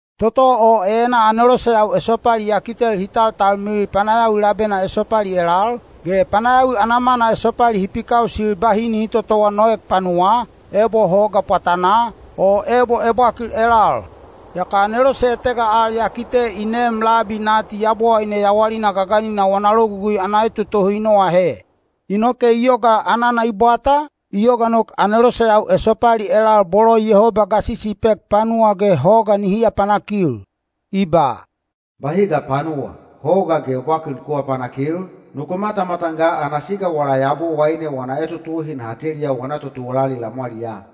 Toto o enaa aneloseyau esopali ya kitel hi taltalmilil panayawi labena esopali elal, ge panayawi ana mana esopali hi pikausil bahi nihi totowa noek panuwaa, ebo hoga pwatanaa, o ebo ebwakil elal. Yaka anelose etega al ya kite i neem labi nati Yabowaine yawalina gaganina wana logugui ana etotohi i noahe. Inoke i yoga anana i bwata, i yoga nok aneloseyau esopali elal bolo Yehoba gasisi i pek panuwa ge hoga nihi apanakil. I ba, “Bahi ga panuwa, hoga ge ebwakil nuku aapanakil, nuku matamatan ga ana siga wala Yabowaine wana etotohi naha teliya wana totuwalali lamwaliyaa.”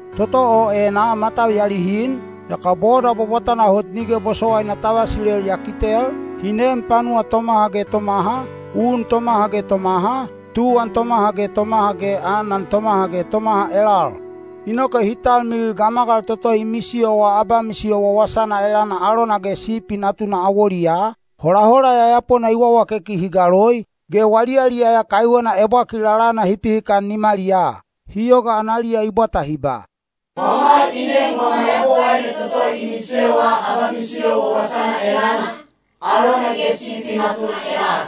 Toto o enaa matau ya lihin, yaka boda bwabwatana hot nige bosowaina ta vasilel ya kitel, hi neem panuwa tomaha ge tomaha, un tomaha ge tomaha, tuwan tomaha ge tomaha ge anan tomaha ge tomaha elal. Inoke hi talmilil gamagal toto i misiyowa abamisiyo wawasana elana alona ge Sipi Natuna awoliyaa, holahola yayapona i wawakeki hi galoi, ge wali yaliyaya kaiwena ebwakil lalana hi pihikan nimaliyaa. Hi yoga analiya i bwata hi ba, “Pwamwal i neem wama Yabowaine toto i misiyowa abamisiyo wawasana elana, alona ge Sipi Natuna elal.”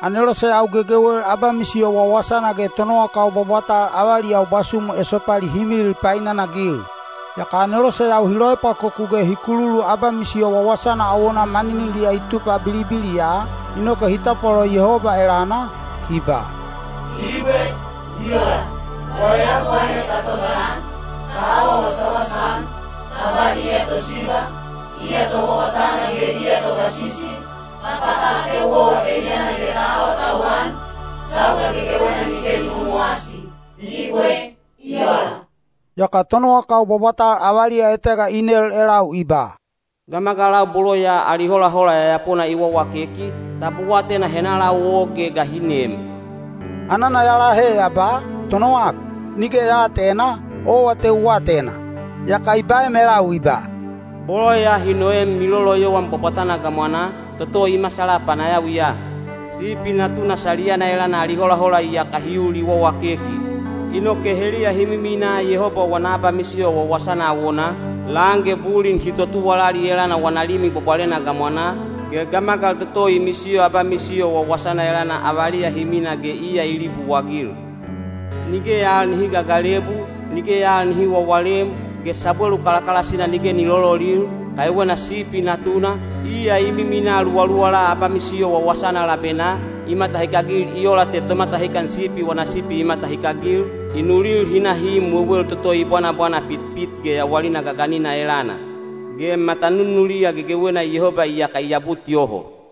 Aneloseyau gegewel abamisiyo wawasana ge tonowakau bwabwatal avaliyau bwasumu esopali hi milil painanagil. Yaka aneloseyau hi loepwakoku ge hi kululu abamisiyo wawasana awonaa maniniliya i tupa bilibiliya, inoke hi tapwalolo Yehoba elana, hi ba, “Ibwe. I ola! Wala Yabowaine ta tobalan, ta awa wasawasa-an, ta ba iya Tosiba, iya Tobwabwatana ge iya Togasisi, ta pata ateu owa eliyana ge ta awatauwan, sauga gegewena nige ni momowasi. Ibwe. I ola!” Yaka tonowakau bwabwatal avaliya etega i nel elau i ba, “Gamagalau bolo ya ali holahola yayapona i wawakeki, tab u atena henalau o ge ga hi neem?” Anana ya lahe ya ba, “Tonowak, nige ya aatena, owa te u atena.” Yaka i baem elau i ba, “Bolo ya hi noem miloloyowan bwabwatana gamwanaa, toto i masala panayawiya. Sipi Natuna saliyana elana ali holahola iyaka hi ul i wawakeki. Inoke heliya hi miminaa Yehoba wana abamisiyo wawasana awonaa, lan ge bulin hi totuwalali elana wana Limi Bwabwalena gamwanaa; ge gamagal toto i misiyo abamisiyo wawasana elana avaliya hi mina ge iya i libuagil. Nige al nihi gagalebu, nige al nihi wawalem, ge sabwelu kalakalasina nige ni lololil, kaiwena Sipi Natuna, iya i miminaa luwaluwala abamisiyo wawasana labenaa, i matahikagil i ola te tomatahikan sipi wana sipi i matahikagil, i nulil hi na hi im wewel toto i bwanabwana pitpit ge yawalina gaganina elana. Ge matanunuliya gegewena Yehoba iyaka i abut yoho.”